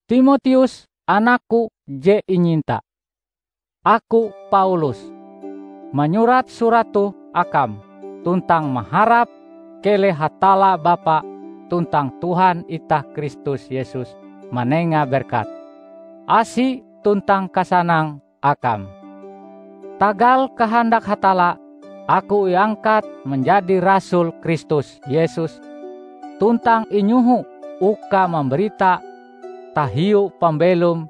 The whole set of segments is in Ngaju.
Timoteus, anakku je inyinta! Aku, Paulus, manyurat surat toh akam, tuntang maharap keleh Hatalla Bapa tuntang Tuhan itah Kristus Yesus manenga berkat, asi tuntang kasanang akam. Tagal kahandak Hatalla, aku iangkat manjadi rasul Kristus Yesus tuntang inyoho uka mambarita tahiu pambelom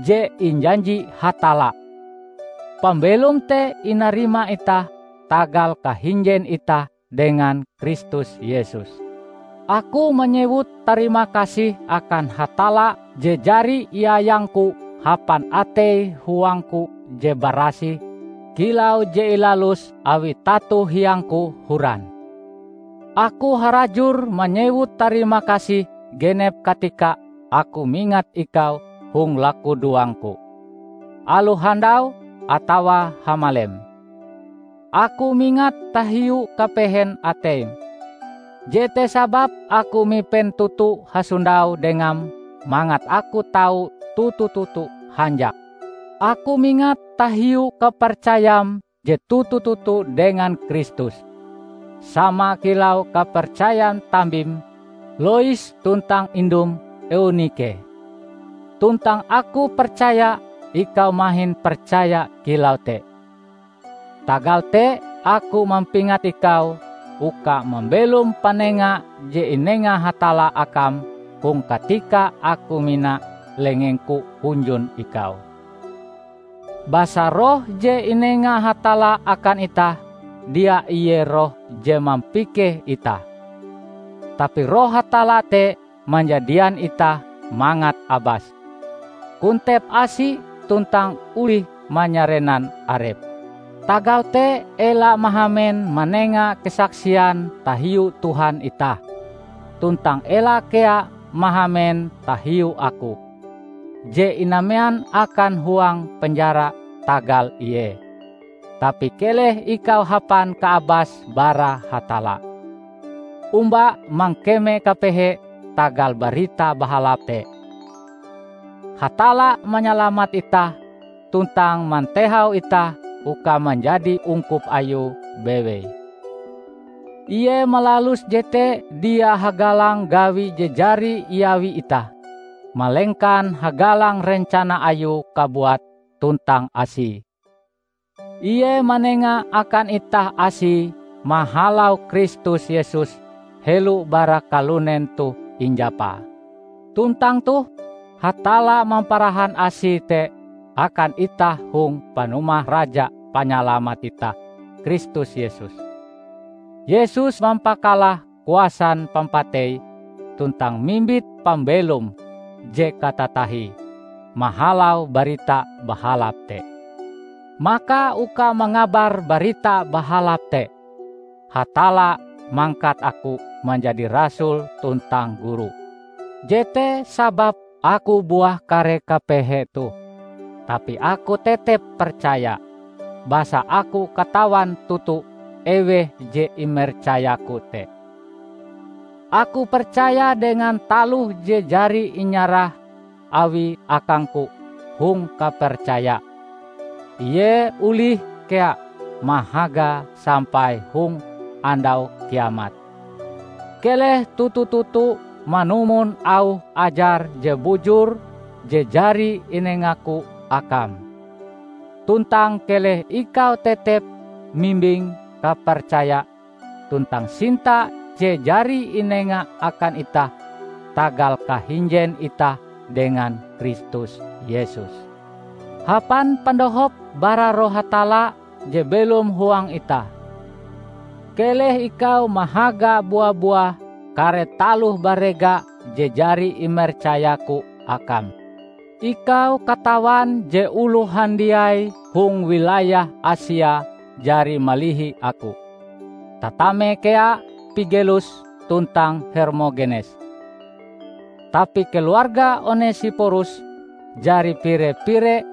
je injanji Hatalla. Pambelom te inarima itah tagal kahinjen itah dengan Kristus Yesus. Aku manyewut tarimakasih akan Hatalla je jari iayangku hapan atei-huangku je barasih kilau je ilalus awi tato hiangku horan. Aku harajur manyewut tarimakasih genep katika aku mingat ikau hong lakudoangku, aloh handau atawa hamalem. Aku mingat tahiu kapehen ateim. Jete sababe aku mipen toto hasondau dengam mangat aku tau toto-toto hanjak. Aku mingat tahiu kapercayam je toto-toto dengan Kristus, sama kilau kapercayan tambim Lois tuntang indum Eunike. Tuntang aku percaya ikau mahin percaya kilau te. Tagal te aku mampingat ikau uka mambelom panenga je inenga Hatalla akam hong katika aku mina lengengku hunjun ikau. Basa Roh je inenga Hatalla akan itah, dia ie Roh je mampikeh itah. Tapi Roh Hatalla te manjadian itah mangat abas, kontep asi tuntang olih manyarenan arep. Tagal te ela mahamen manenga kesaksian tahiu Tuhan itah, tuntang ela kea mahamen tahiu aku, je inamean akan huang penjara tagal Ie. Tapi keleh ikau hapan kaabas bara Hatalla, omba mangkeme kapehe tagal Barita Bahalap te. Hatalla manyalamat itah tuntang mantehau itah uka manjadi ungkup ayue bewei. Ie malalus jete dia hagalang gawi je jari iawi itah, malengkan hagalang rencana Ayue kabuat tuntang Asie. Ie manenga akan itah Asie mahalau Kristus Yesus helo bara kalunen toh injapa. Tuntang toh, Hatalla mamparahan Asie te akan itah hong panumah Raja Panyalamat itah Kristus Yesus. Yesus mampakalah kuasan pampatei tuntang mimbit pambelom je katatahie mahalau Barita Bahalap te. Maka uka mangabar Barita Bahalap te, Hatalla mangkat aku manjadi rasul tuntang guru. Jete sababe aku buah kare kapehe toh, tapi aku tetep percaya, basa aku katawan toto eweh je imercayaku te. Aku percaya dengan taloh je jari inyarah Awie akangku hong kapercaya, Ie olih kea mahagae sampai hong Andau Kiamat. Keleh toto-toto manumon auh ajar je bujur je jari inengaku akam. Tuntang keleh ikau tetep mimbing kapercaya tuntang sinta je jari inenga akan itah tagal kahinjen itah dengan Kristus Yesus. Hapan pandohop bara Roh Hatalla je belom huang itah, keleh ikau mahaga bua-buah kare taloh barega je jari imercayaku akam. Ikau katawan je oloh handiai hong wilayah Asia jari malihi aku, tatame kea Pigelus tuntang Hermogenes. Tapi keluarga Onesiporus jari pire-pire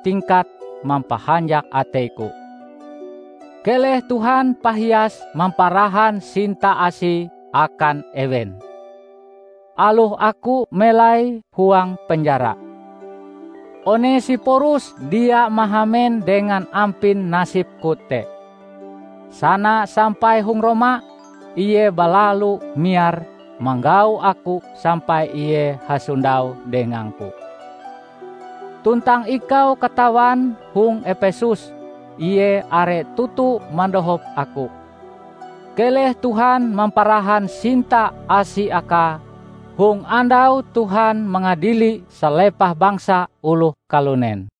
tingkat mampahanjak ateiku. Keleh Tuhan pahias mamparahan sinta asi akan ewen. Aloh aku melai huang penjara, Onesiporus dia mahamen dengan ampin nasibku te. Sana sampai hong Roma, ie balalu miar manggau aku sampai ie hasondau dengangku. Tuntang ikau katawan hong Epesus ie are toto mandohop aku. Keleh Tuhan mamparahan sinta asi akae hong andau Tuhan mangadili salepah bangsa oloh kalunen.